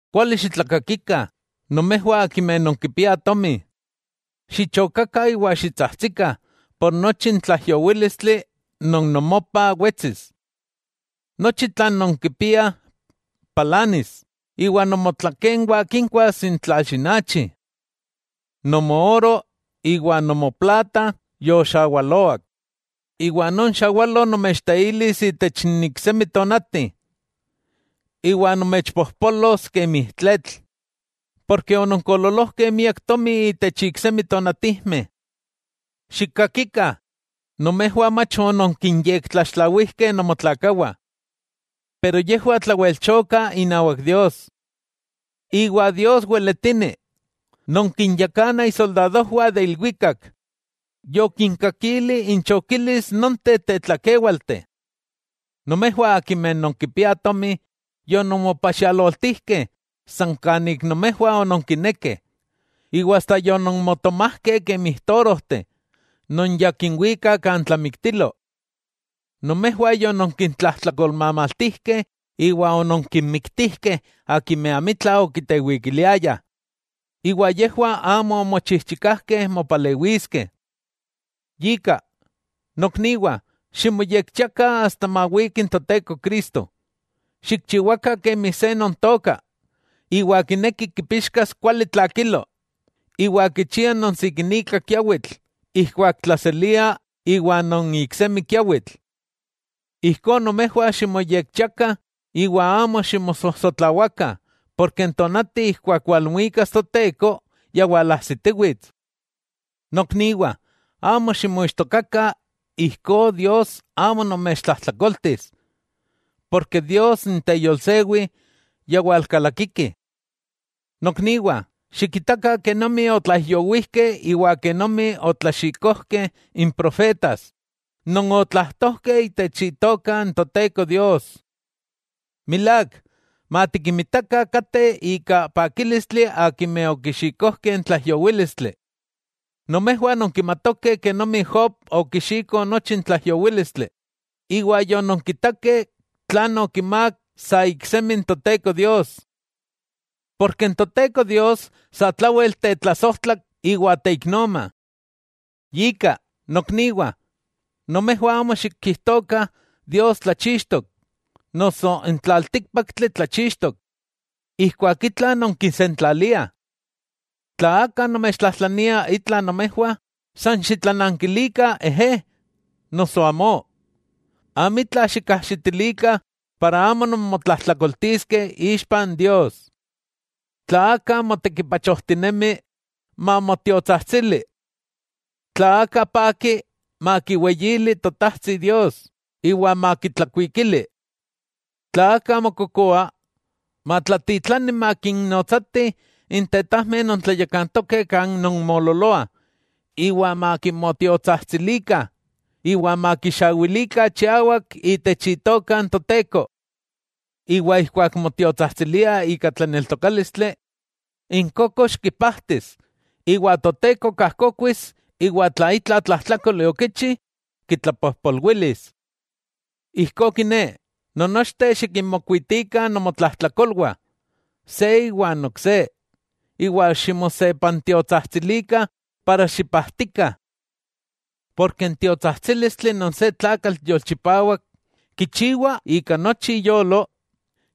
¡Kuali xitlakakikah nomejwah akimeh nonkipiah tomi! Xichokakah iwa xitsajtsikah por nochi n tlaijyowílistli non nomopah wetsis. Nochi tlan nonkipiah palanis, iwa nomotlakenwah kinkuas n tlalxinachi. Nomo oro iwa nomo plata yoxawaloak, iwa non xawalo nomechteilis itech n iksemi tonati, iwa nomechpojpolos kemi tletl, porke ononkoololojkeh miak tomi itech iksemi tonatijmeh. ¡Xikakikah! Nomejwah mach ononkinyektlaxtlawijkeh nomotlakawah. Yejwah tlawelchokah inawak Dios. Iwa Dios weletini non kinyakana isoldadojwah de ilwikak yokinkakilih inchokilis nonteh tetlakéwalteh. Nomejwah akimeh non kipiah tomi, yononmopaxialoltijkeh san kanik nomejwah ononkinekeh, iwa asta yononmotomajkeh kemi torojteh non ya kinwikah kan tlamiktilo. Nomejwah yononkintlajtlakolmamaltijkeh iwa ononkinmiktijkeh akimeh amitla okitewikiliayah, iwa yejwah amo omochijchikajkeh mopalewiskeh. Yika, nokniwah, ximoyekchiakah asta mawiki n Toteko Cristo. Xikchiwakah kemi se non tooka, iwa kineki kipixkas kuali tlakilo, iwa kichia non sikinika kiawitl ijkuak tlaselia iwa non iksemi kiawitl. Ijkó nomejwah ximoyekchiakah, iwa amo ximosojsotlawakah, porke n tonati ijkuak walmuikas Toteko ya walajsitiwits. Nokniwah, amo ximoixtokakah, ijkó Dios amo nomechtlajtlakoltis, porke Dios n teyolsewi, ya walkalakiki. Nokniwah, xikitakah kenomi otlaijyowijkeh iwa kenomi otlaxikojkeh n profetas, non otlajtojkeh itech Itoka n Toteko Dios. Milák, matikinmitakah kateh ika pakílistli akimeh okixikojkeh n tlaijyowílistli: Nomejwah nonkimatokeh kenomi Job okixiko nochi n tlaijyowílistli, iwa yononkitakeh tlan okimák sa iksemi n Toteko Dios. Porke n Toteko Dios satlawel tetlasojtlak iwa teiknoma. Yika, nokniwah, nomejwah amo xikijtokah, “Dios tlachixtok,” noso “n tlaltíkpaktli tlachixtok,” ijkuak itla nonkisentlaliah. Tla aka nomechtlajtlania itla nomejwah san xitlanankilikah “ejé” noso “amó”. Amitla xikajaxitilikah para amo nonmotlajtlakoltiskeh ixpa n Dios. Tla aka motekipachojtinemi, mamotiotsajtsili. Tla aka paki, makiweyili totajtsi Dios iwa makitlakuikili. Tla aka mokokoa, matlatitlani makinnotsatih n tetajmeh non tlayakantokeh kan nonmoololoah iwa makimotiotsajtsilikah, iwa makixawilikah chiawak itech Itoka n Toteko. Iwa ijkuak motiotsajtsiliah ika tlaneltokálistli, n kókoxki pajtis iwa Toteko kajkokuis iwa tla itla tlajtlákoli okichi, kitlapojpolwilis. Ijkó kiné, non nochteh xikinmokuitikah nomotlajtlakolwah se iwan ok se, iwa ximosepantiotsajtsilikah para xipajtikah. Porke n tiotsajtsílistli non se tlakatl yolchipawak kichiwa ika nochi iyolo,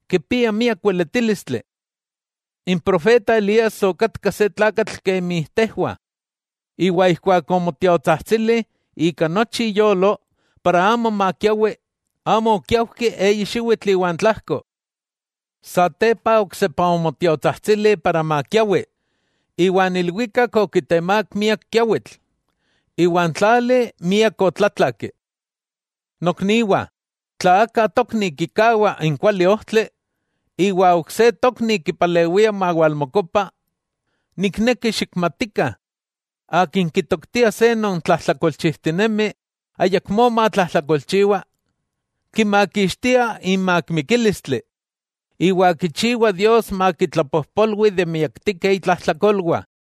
kipia miak weletílistli. N profeta Elías okatka se tlakatl kemi tejwah, iwa ijkuak omotiotsajtsili ika nochi iyolo para amo makiawi, amo okiaujki eyi xiwitl iwa n tlajko. Satepa oksepa omotiotsajtsili para makiawi, iwan ilwikak okitemák miak kiawitl, iwa n tlali miak otlatlaki. Nokniwah, tla aka tokni kikawa n kuali ojtli, iwa ok se tokni kipalewia mawalmokopa, nikneki xikmatikah, akin kitoktia se non tlajtlakolchijtinemi ayakmó matlajtlakolchiwa, kimakixtia imak mikílistli, iwa kichiwa Dios makitlapojpolwi de miaktijkeh itlajtlakolwah.